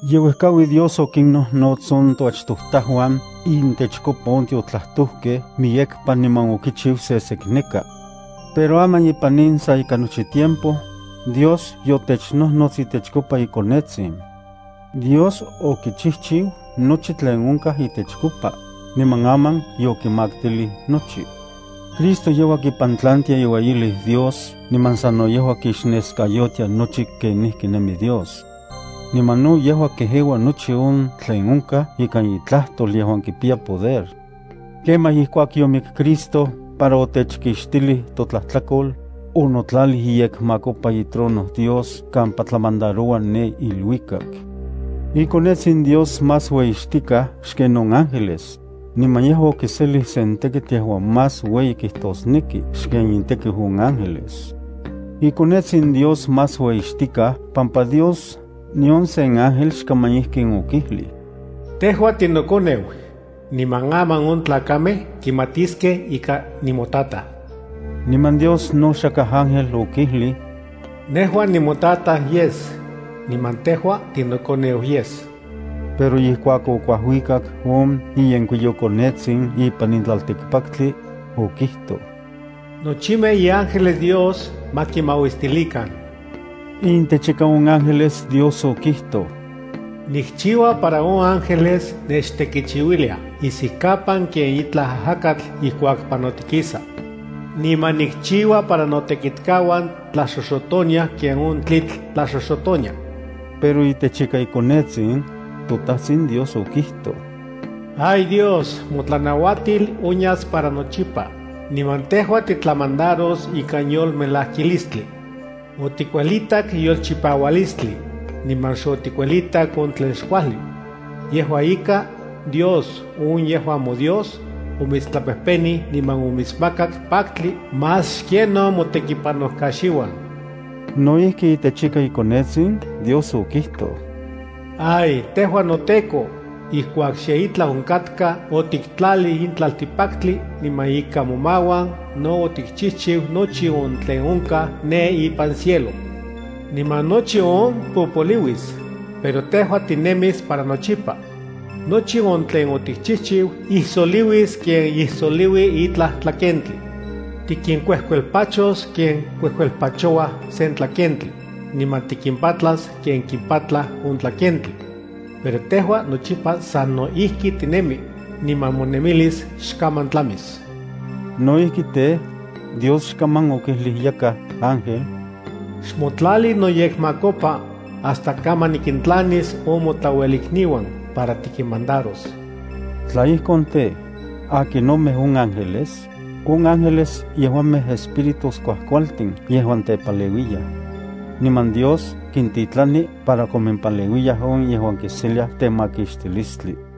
Yeuejkaui Dios okinnojnots on toachtojtajuan intechkopa on tiotlajtojkej miyekpa niman okichiu sesekneka. Pero aman ipan in sa ika nochi tiempo, Dios yotechnojnots itechkopa iKonetsin. Dios okichijchiu nochi tlen onkaj itechkopa, niman aman yokimaktilij nochi. Cristo yejua kipantlantia iueyilis Dios niman sano yejua kixneskayotia nochi kenijki nemi Dios. Niman no yejua kejeua nochi on tlen onkaj ikan itlajtol yejuan kipiya poder. Kemaj ijkuak yomik Cristo para otechkixtilij totlajtlakol, onotlalij iyekmakopa itrono Dios kampa tlamandaroua ne iluikak. IKonetsin Dios más ueyixtikaj xken on ángeles, niman yejua okiselij sen tekitl yejuan más ueyi kijtosneki xken intekiu on ángeles. IKonetsin Dios más ueyixtikaj pampa Dios nion sen ángel xkaman ijkin okijlij: Tejua tinoKoneu, niman aman on tlakamej kimatiskej ika nimoTataj. Niman Dios no xakaj ángel okijlij: Nejua nimoTataj yes, niman tejua tinoKoneu yes. Pero ijkuak okuajuikak on iyenkuiyoKonetsin ipan in tlaltikpaktli, okijtoj: Nochimej iángeles Dios ma kimauistilikan. Intechika on ángeles Dios okijtoj: Nikchiua para on ángeles nechtekichiuiliaj isijkapan ken itlaj ajakatl ijkuak panotikisa. Niman nikchiua para notekitkauan tlaxoxotoniaj ken on tlitl tlaxoxotonia. Pero itechika iKonetsin, toTajtsin Dios okijtoj: Ay Dios, motlanauatil onyas para nochipa, niman tejua titlamandaros ikan yolmelajkilistli. Otikuelitak yolchipaualistli, niman xotikuelitak on tlen xkuajli. Yejua ika, Dios on yejuan moDios, omitstlapejpenij niman omitsmakak paktli más xken on motekipanojkaxiuan. No ijki itechika iKonetsin Dios okijtoj: “Ay noTEKO, ijkuak xe itlaj onkatka, otiktlalij in tlaltikpaktli, niman ikan momauan no otikchijchiu nochi on tlen onkaj ne ipan cielo. Niman nochi on popoliuis, pero tejua tinemis para nochipa. Nochi on tlen otikchijchiu ijsoliuis ken ijsoliui itlaj tlakentli. Tikinkuejkuelpachos ken kuejkuelpachouaj sen tlakentli, niman tikimpatlas ken kipatlaj on tlakentli. Pero tejua nochipa sano ijki tinemi, niman monemilis xkaman tlamis.” No ijki tej, Dios xkaman okijlij yakaj ángel: Xmotlali noyekmakopa, hasta kaman nikintlanis on motlauelikniuan para tikinmandaros. Tla ijkon tej, ¿akinomej on ángeles? On ángeles yejuamej espíritus kuajkualtin yejuan tepaleuiyaj. Niman Dios kintitlani para komimpaleuiyaj on yejuan kiseliaj temakixtilistli.